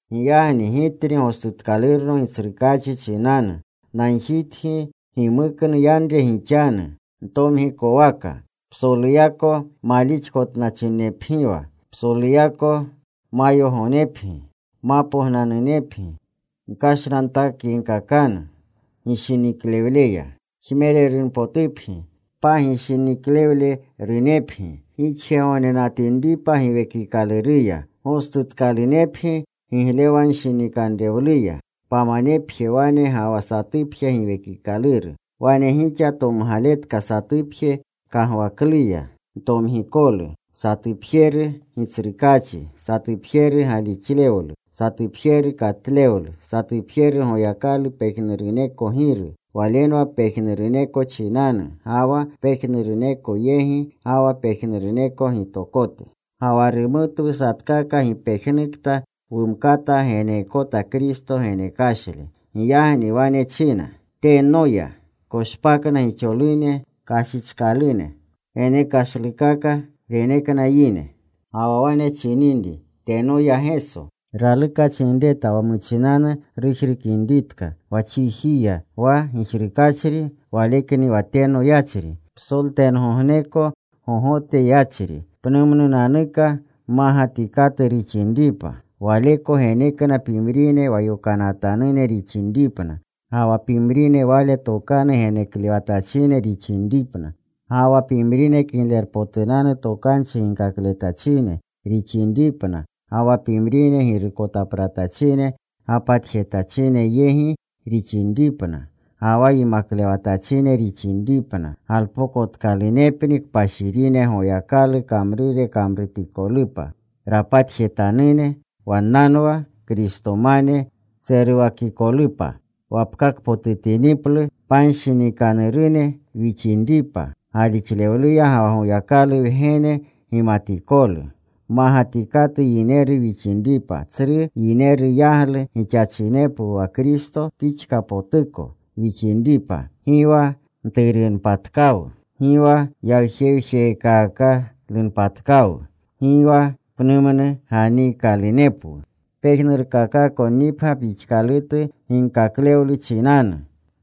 Giyagni gitni, gostutkalurno Gitsrukaachi chinanu, nagjitgi gimuknu yanre gixanu ntomgikowaka. Psoluyako malixkotnachinepgiwa. Psoluyako mayogonepgi. Mapognanunepgi gkashnantakyegkakanu gishiniklewleya. Jmererunpotupgi pagishiniklewlerunepgi gixjegognenatinripa Giwekikaluruya. Gostutkalunepgi giglewanshinikanrewluya. Pamanepje wane ga wa satupje Giwekikaluru. Wane gixa tomgaletka satupje kagwakluya ntomgikolu. Satupjeru Gitsrukaachi. Satupjeru galixlewlu. Satupjeru katlewlu. Satupjeru Goyakalu pejnuruneko Giru. Walenwa pejnuruneko chinanu, ga wa pejnuruneko yegi, ga wa pejnuruneko gitokote. Ga wa rumutwu satkakwu gipejnukta wumkata geneekota Kristo genekashle. Giyagni wane china: Teno ya. Koshpakna gixolune kashichkalune. Genekashlukaka renekna yine. Ga wa wane chininri, “Teno ya Geso,” raluka chinreta wa muchinanu rujrukinritka. Wa chiji ya. Wa gijrukachri Walekni wa teno yachri, psoltengogneko gogote yachri, pnumnunanuka mmagatikatu rixinripa. Waleko genekna pimrine wa yokanatanune rixinripna, ga wa pimrine Wale tokanu geneklewatachine rixinripna, ga wa pimrine Kiglerpotunanu Tokanchi ginkakletachine rixinripna, ga wa pimrine girukotapratachine gapatjetachine yegi rixinripna, ga wa yimaklewatachine rixinripna. Galpokotkalunepni kpashirine Goyakalu kamrure kamrutikolupa, rapatjetanune, wannanwa Kristomane, tseruwakikolupa. Wapkaapotutiniplu panshinikanurune wixinripa galixluya ga wa Goyakalu Wgene gimatikolu. Mmagatikatu yineru wixinripa, tsru yineru yaglu gixachinepwu wa Kristo pixkapotuko, wixinripa. Gi wa mturunpatkawu. Gi wa yawjewjekaakalunpatkawu. Gi wa pnumnu ganiikalunepwu pejnurkakakonnipgya pixkalutu ginkaklewlu chinanu,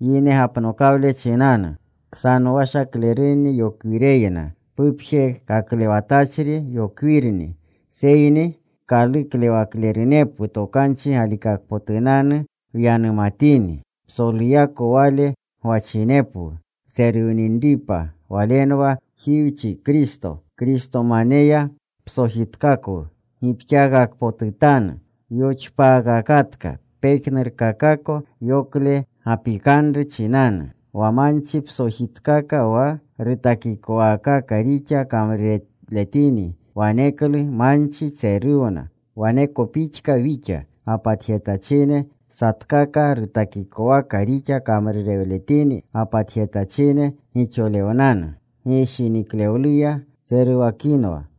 yine gapnokawle chinanu, ksanowashaklerunni yokwireyna, pupjekaklewatachri yokwirni. Seyni kaluklewaklerunepwu tokanchi galikakpotunanu wyanumatini. Psoluyako Wale gwachinepwu wtseruwninripa. Walenwa Jiwchi, Kristo. Kristomaneya psojitkaka gipxaakakpotutanu. Yoxpaakakatka pejnurkakako yokle gapikanru chinanu. Wa manchi psojitkaka wa rutakikowaakaka rixa kamrurewletini, waneklu manchi tseruwna. Waneko pixka wixa. Wa gapatjetachine satkaka rutakikowaka rixa kamrurewletini gapatjetachine gixolewnanu. Gishiniklewluya tseruwakinwa.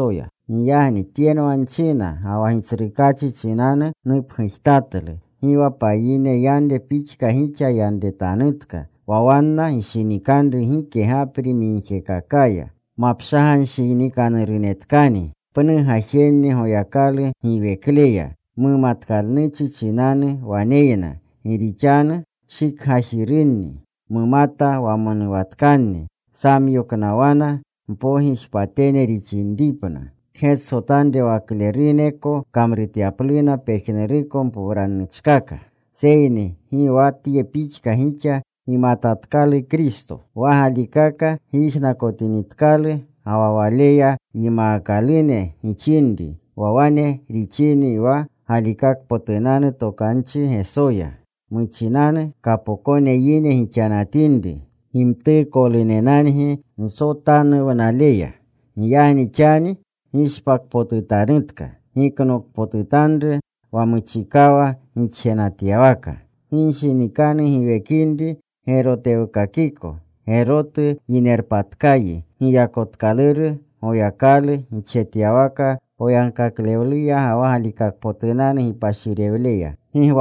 Giyagni tyenwa nchina, ga wa Gitsrukaachi chinanu nupgujtatlu: Gi wa payine yanre pixka gixa yaletanutka wa wanna gishinikanru gike gapri migjekakaya. Mapshaganshinikanurunetkani. Pnu gajenni Goyakalu giwekleya mumatkalnuchi chinanu waneyna, gi rixanu shikgajirunni. Mumata wamonuwatkanni. Samyoknawana mpogijpatene rixinripna. Kgetsotanrewakleruneko kamrutyapluna pejnuruko mpowranuchkaka. Seyni gi wa tye pixka gixa gimatatkalu Kristo. Wa galikaka gyijnakotinitkalu ga wa Waleya yimaakalune gixinri, wa wane rixini wa galikakpotunanu tokanchi Gesoya. Muchinanu kapokone yine gixanatinri gimtuukolunenangi nsotanuwnaleya. Giyagni xani gishpakpotutanutka. Giknokpotutanru wa muchikawa gixjenatyawaka. Ginshinikanu giwekinri gerotewkakiko. Gerotu yinerpatkayi giyakotkaluru Goyakalu gixjetyawaka poyagkaklewluya ga wa galikakpotunanu gipashirewleya.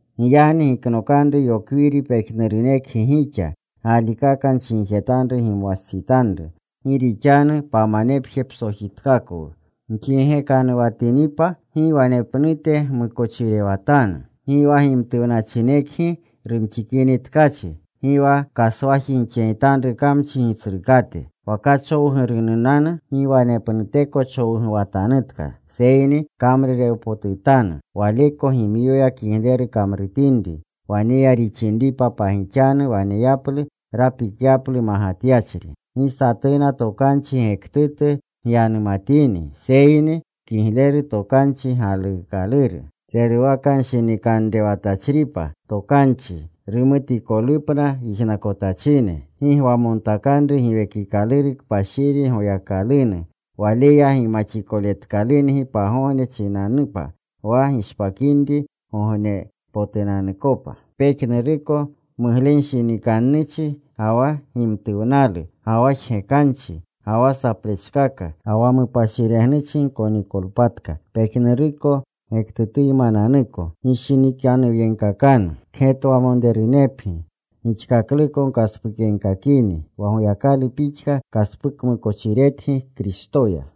Giyagni giknokanru yokwiri. Pejnurunekgi gixa galikaka nchinjetanru gimwastsitanru. Gi rixanu pamanepje psojitkakwu. Gjigekanuwatinipa gi wanepnute gmukochirewatanu. Gi wa gimtuwnachinekgi rumxikini tkachi. Gi wa kaswaji gixyegitanru kamchi gitsrukate. Wa kachowgurunanu, gi wanepnuteko chowguwatanutka. Seyni kamrurewpotutanu, waleko gimyoya kigleru kamrutinri, waneya rixinripa pagixanu waneyaplu rapikyaplu magatyachri. Gi satuna tokanchi gektutu gyanumatini, seyni kigleru tokanchi galuukaluru, tseruwakanshinikanrewatachripa tokanchi, rumutikolupna yijnakotachine. Gi gwamontakanru Giwekikaluru Kpashiri Goyakalunu. Waleya gimaxikoletikalungi pagogne chinanupa wa gishpakinri gognepotunanukopa. Pejnuruko muglenshinikannuchi ga wa gimtuwnalu, ga wa jgekanchi, ga wa saplechkaka, ga wa mupashiregnuchi gkonikolpatka, pejnuruko gektutuymananuko. Gishinikanuwyegkakanu. Kgetwamonrerunepgi. Gixkakluko gkaspukyegkakini, wa Goyakalu pixka kaspukmukochiretgi Kristoya.